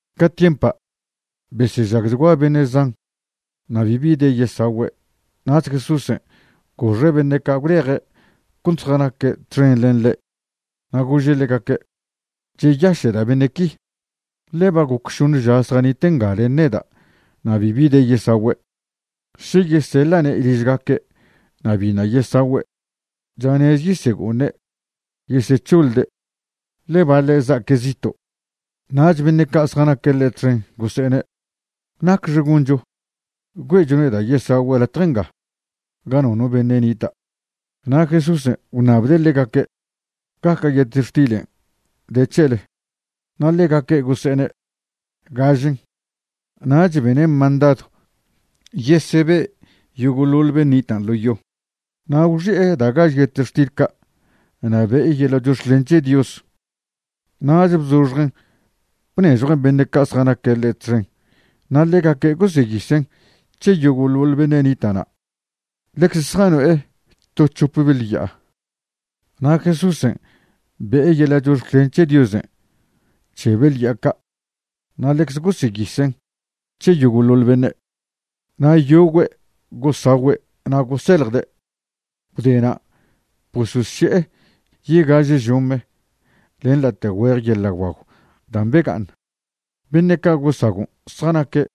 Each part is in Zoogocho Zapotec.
Ca tiempa' besežagchgua beṉe' zan na' bibi de yesagüe'. Nach Jesúsen' goxe' beṉe' ca' gwleje' cont zjanaque' txen len ḻe' na' gože' ḻegaque': ―Cheyaše'da' beṉe' qui, ḻe ba goc šoṉe ža zjanite' nga len neda' na' bibi de yesagüe'. Še yeseḻa'ne' ližgaque' na' biṉa' yesagüe', chanez yesego'oṉe' yesec̱hoḻde', ḻe baḻe' za'aque' zito'. Nach beṉe' ca' zjanaque' ḻe' txen gose'ene': ―¿Nacxe goncho güe'chone' da' yesagüe' latje nga ga nono beṉe' nita'? Na' Jesúsen' gwṉabde' ḻegaque': ―¿Gaca' yetextilen' de c̱hele? Na' ḻegaque' gose'ene': ―Gažen. Nach bene' mandadw yesebe' yogo'ḻoḻ ben' nitan' ḻo yo, na' gwxi'e da' gaž yetextil ca' na' be'e yeḻa' chox̱clen c̱he Dios, nach bzoxjen' bnežjuen' beṉe' ca' zjanaque' ḻe' txen na' ḻegaque' goseyisen' c̱he yogo'ḻoḻ beṉe' nita' na'. Ḻeze zjano'e to c̱hop beḻ ya'a, na' Jesúsen' be'e yeḻa' chox̱clen c̱he Diosen' c̱he beḻ ya'a ca' na' ḻeze goseyisen' c̱he yogo'ḻoḻ beṉe'. Na' yogüe' gosagüe' na' goseljde'. Gwdena' bososše'e yegaže žome len late' güeje yeḻa' guagw da' bega'aṉ. Beṉe' ca' gosagon' zjanaque'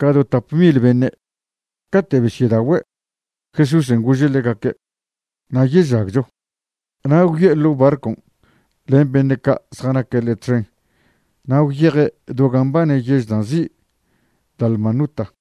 ca do tap mil beṉe'. Cate' ba besyedagüe', Jesúsen' gože' ḻegaque': ―“Nayežagcho”, na' gwyo'e ḻo' barcon' len beṉe' ca' zjanaque' ḻe' txen na' gwyeje' do gan' mbane yež da' nzi' Dalmanuta.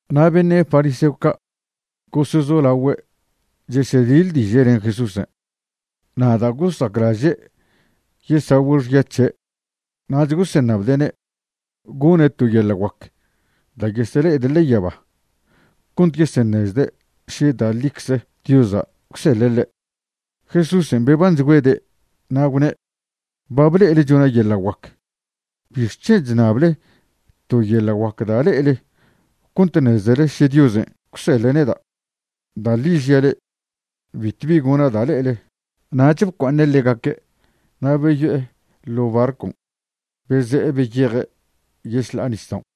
Na' beṉe' fariseo ca' gosezolagüe' chesediḻdiže' len Jesúsen'. Na' da' gosaclaže' yesagüe' xya c̱he' nach goseṉabde'ne' gone' to yeḻa' guac da' yesele'ede' ḻe'e yaba cont yeseṉezde' še da' ḻicze Diosa' gwseḻe' ḻe'. Jesúsen' bebanchgüede' na' gwne': ―Ba ble'ele chona' yeḻa' guac. ¿Bixc̱hen' chṉable to yeḻa' guac da' le'ele cont ṉezele še Diosen' gwseḻe' neda'? Da' ḻi žia' le'e, bitwbi gona' da' le'ele. Nach bcua'aṉe' ḻegaque' na' beyo'e ḻo' barcon' beze'e beyeje' yešḻa'a nisdaon'.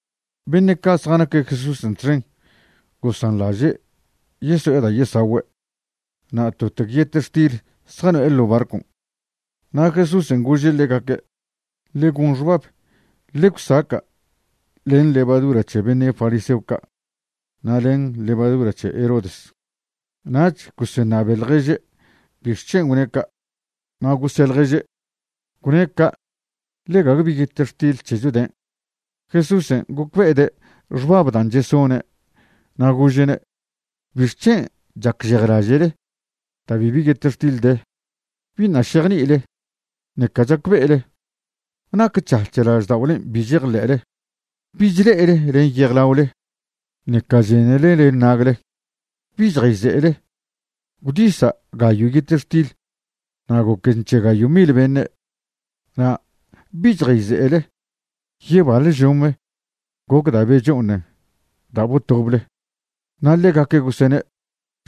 Beṉe' ca' zjanaque' Jesúsen' txen gosanḻaže' yeso'e da' yesagüe', na' totec yetextil zjano'e ḻo' barcon'. Na' Jesúsen' gože' ḻegaque': ―Ḻe gon xbab, ḻe gwsaca' len levadura c̱he beṉe' fariseo ca' na' len levadura c̱he Herodes. Nach goseṉabe ḻježe' bixc̱hen' gwne' ca', na' gose' ḻježe': ―Gwne' ca' ḻe gague bi yetextil c̱hecho den'. Jesúsen' gocbe'ede' xbab dan' chesone' na' gože'ne': ―¿Bixc̱hen' chacžejlaže'le da' bibi yetextil de? ¿Biṉa' šejni'ile, ṉeca chacbe'ele? ¿Nac c̱hac̱h lažda'olen' bi chejḻe'le? ¿Bi chle'ele len yejlaole, ṉeca chenele len nagle? ¿Bi chjayze'ele? Gwdisa' gayo' yetextil na' goquen c̱he gayo' mil beṉe', na' ¿bi chjayze'ele yebaḻe žome goc da' becho'oṉen da' botoble? Na' ḻegaque' gosene':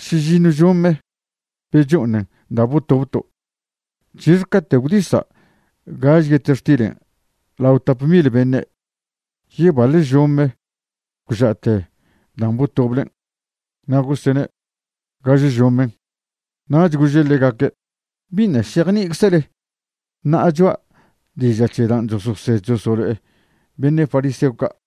―Šižiṉw žome becho'oṉen da' botobto'. ―¿C̱hixe caten' gwdisa' gaže yetextilen' lao tap mil beṉe'? ¿Yebaḻe žome gwža'te dan' botoblen'? Na' gosene': ―Gaže žomen'. Nach gože' ḻegaque': ―¿Biṉa' šejni'iczele ṉa'a cho'a diža' c̱he dan' chososed chosolo'e beṉe' fariseo ca'?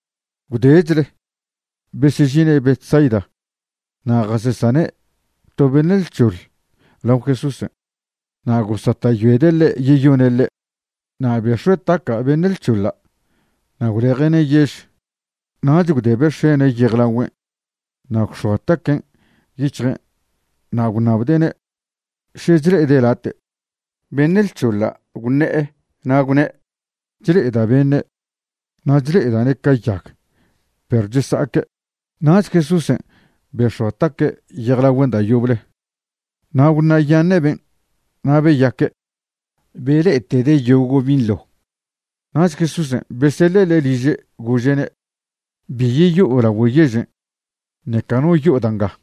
Gwdechle besežine' Betsaida na' jasesane' to beṉe' lc̱hoḻ lao Jesúsen', na' gosata'yoede' ḻe' yeyone' ḻe'. Na' bex̱ue' taca' beṉe' lc̱hoḻa' na' gwleje'ne' yež. Nach gwdebe' x̱ene' yejlagüen' na' gwx̱oa taquen' yic̱hje' na' gwṉabde'ne' še chle'ede' late'. Beṉe' lc̱hoḻa' gwṉe'e na' gwne': ―Chle'eda' beṉe', na' chle'eda'ne' ca yag, perw chesa'aque'. Nach Jesúsen' bex̱oa taque' yejlagüen' da' yoble, na' gwṉa'yaṉe' ben' na' beyaque', bele'etede' yogo' binḻo. Nach Jesúsen' beseḻe' ḻe' liže', gože'ne': ―Bi yeyo'o lagüe yežen', ṉeca no yo'o da' nga.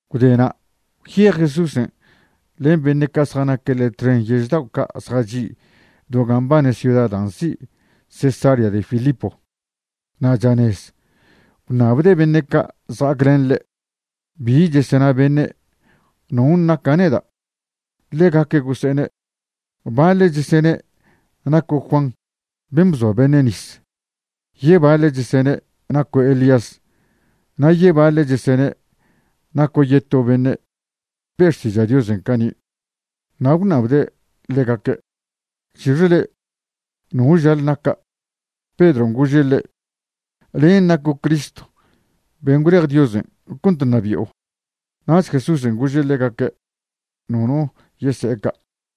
Gwdena' gwyej Jesúsen' len beṉe' ca' zjanaque' ḻe' txen yež dao' ca' zjachi' do ga mbane ciuda da' nzi' Cesarea de Filipo. Na' chanez gwṉabde' beṉe' ca' zja'aclen ḻe': ―¿Bi chesena beṉe'? ¿Non' naca' neda'? Ḻegaque' gose'ene': ―Baḻe' chesene' naco' Juan ben' bzoa beṉe' nis, yebaḻe' chesene' naco' Elías, na' yebaḻe' chesene' naco' yeto beṉe' be' xtiža' Dios cani'. Na' gwṉabde' ḻegaque': ―¿C̱hixe le'e? ¿no žale naca'? Pedron' gože' ḻe': ―Len' naco' Cristo ben' gwlej Diosen' cont ṉabi'o. Nach Jesúsen' gože' ḻegaque' nono yese'e ca'.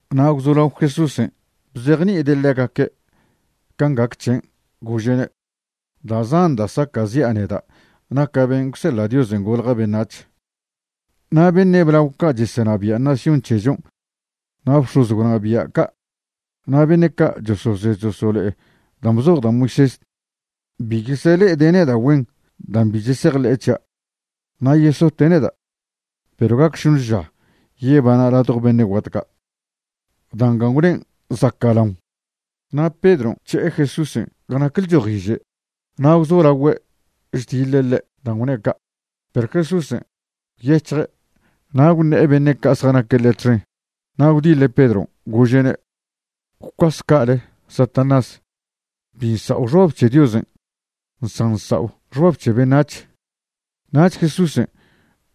Na' gwzolao Jesúsen' bzejni'ide' ḻegaque' can' gac c̱hen', gože'ne': ―Da' zan da' saca'zi'a neda' naca' ben' gwseḻa' Diosen' golja' beṉac̱h. Na' beṉe' blao ca' chesenabia' nación c̱hechon' na' bx̱oz gwnabia' ca' na' beṉe' ca' chososed chosolo'e dan' bzoj da' Moisés bi yesele'ede' neda' güen da' bi chesejḻe'e c̱hia', na' yesote' neda', perw gacch šoṉe ža yebana' ladjo beṉe' guat ca'. Da' nga gwnen' zaca'laon. Na' Pedron' gwc̱he'e Jesúsen' ga nac lchojiže' na' gwzolagüe' chdiḻe' ḻe' dan' gwne' ca'. Perw Jesúsen' gwyec̱hje' na' gwṉe'e beṉe' ca' zjanaque' ḻe' txen, na' gwdiḻe' Pedron', gože'ne': ―¡Gwcuase ca'ale Satanás! Bi nsa'o xbab c̱he Diosen' san nsa'o xbab c̱he beṉac̱h. Nach Jesúsen'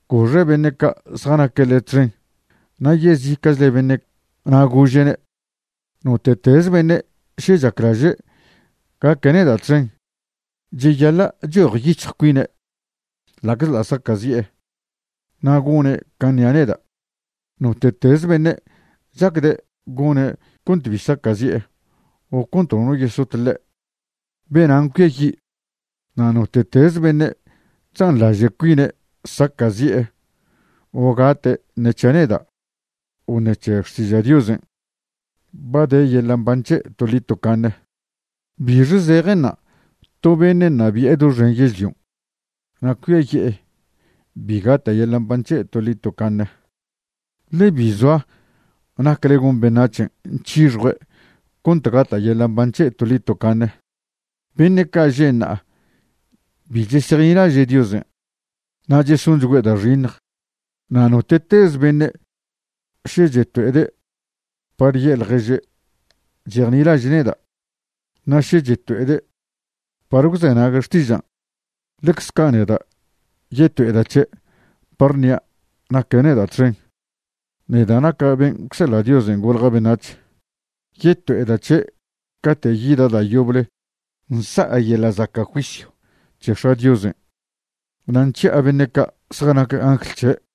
goxe' beṉe' ca' zjanaque' ḻe' txen na' yezica'chle beṉe' na' gože'ne': ―Note'teze beṉe' še chaclaže' gaque' neda' txen, cheyaḻa' chojyic̱hj cuine', ḻa'czḻa' saca'zi'e, na' gone' can' ṉia' neda'. Note'teze beṉe' chacde' gone' cont bi saca'zi'e o cont nono yesot ḻe', benan' cuiayi', na' note'teze beṉe' chzanḻaže' cuine' saca'zi'e o gate' ṉe c̱hia' neda' o ṉec̱he xtiža' Diosen', ba de yeḻa' mban c̱he' toḻi tocaṉe. ¿Bixe zejenṉa' to beṉe' ṉabi'e doxen yežlion' na' cuiaye'e bi gata' yeḻa' mban c̱he' toḻi tocaṉe? Ḻe bi zoa nacle gon beṉac̱hen' c̱hixjue' cont gata' yeḻa' mban c̱he' toḻi tocaṉe. Beṉe' ca' že' ṉa'a bi chesejnilaže' Diosen' na' chesonchgüe' da' xiṉj. Na' note'teze beṉe' še cheto'ede' par ye'e ḻježe' chejnilaže' neda', na' še cheto'ede' par gwzenague' xtižan', ḻecze ca' neda' yeto'eda' c̱he' par ṉia' naque' neda' txen, neda' naca' ben' gwseḻa' Dios golja' beṉac̱h. Yeto'eda' c̱he' cate' yida' da' yoble nsa'a yeḻa' zaca' juisyw c̱he X̱a' Diosen' na' nc̱hia' beṉe' ca' zjanac angl c̱he'.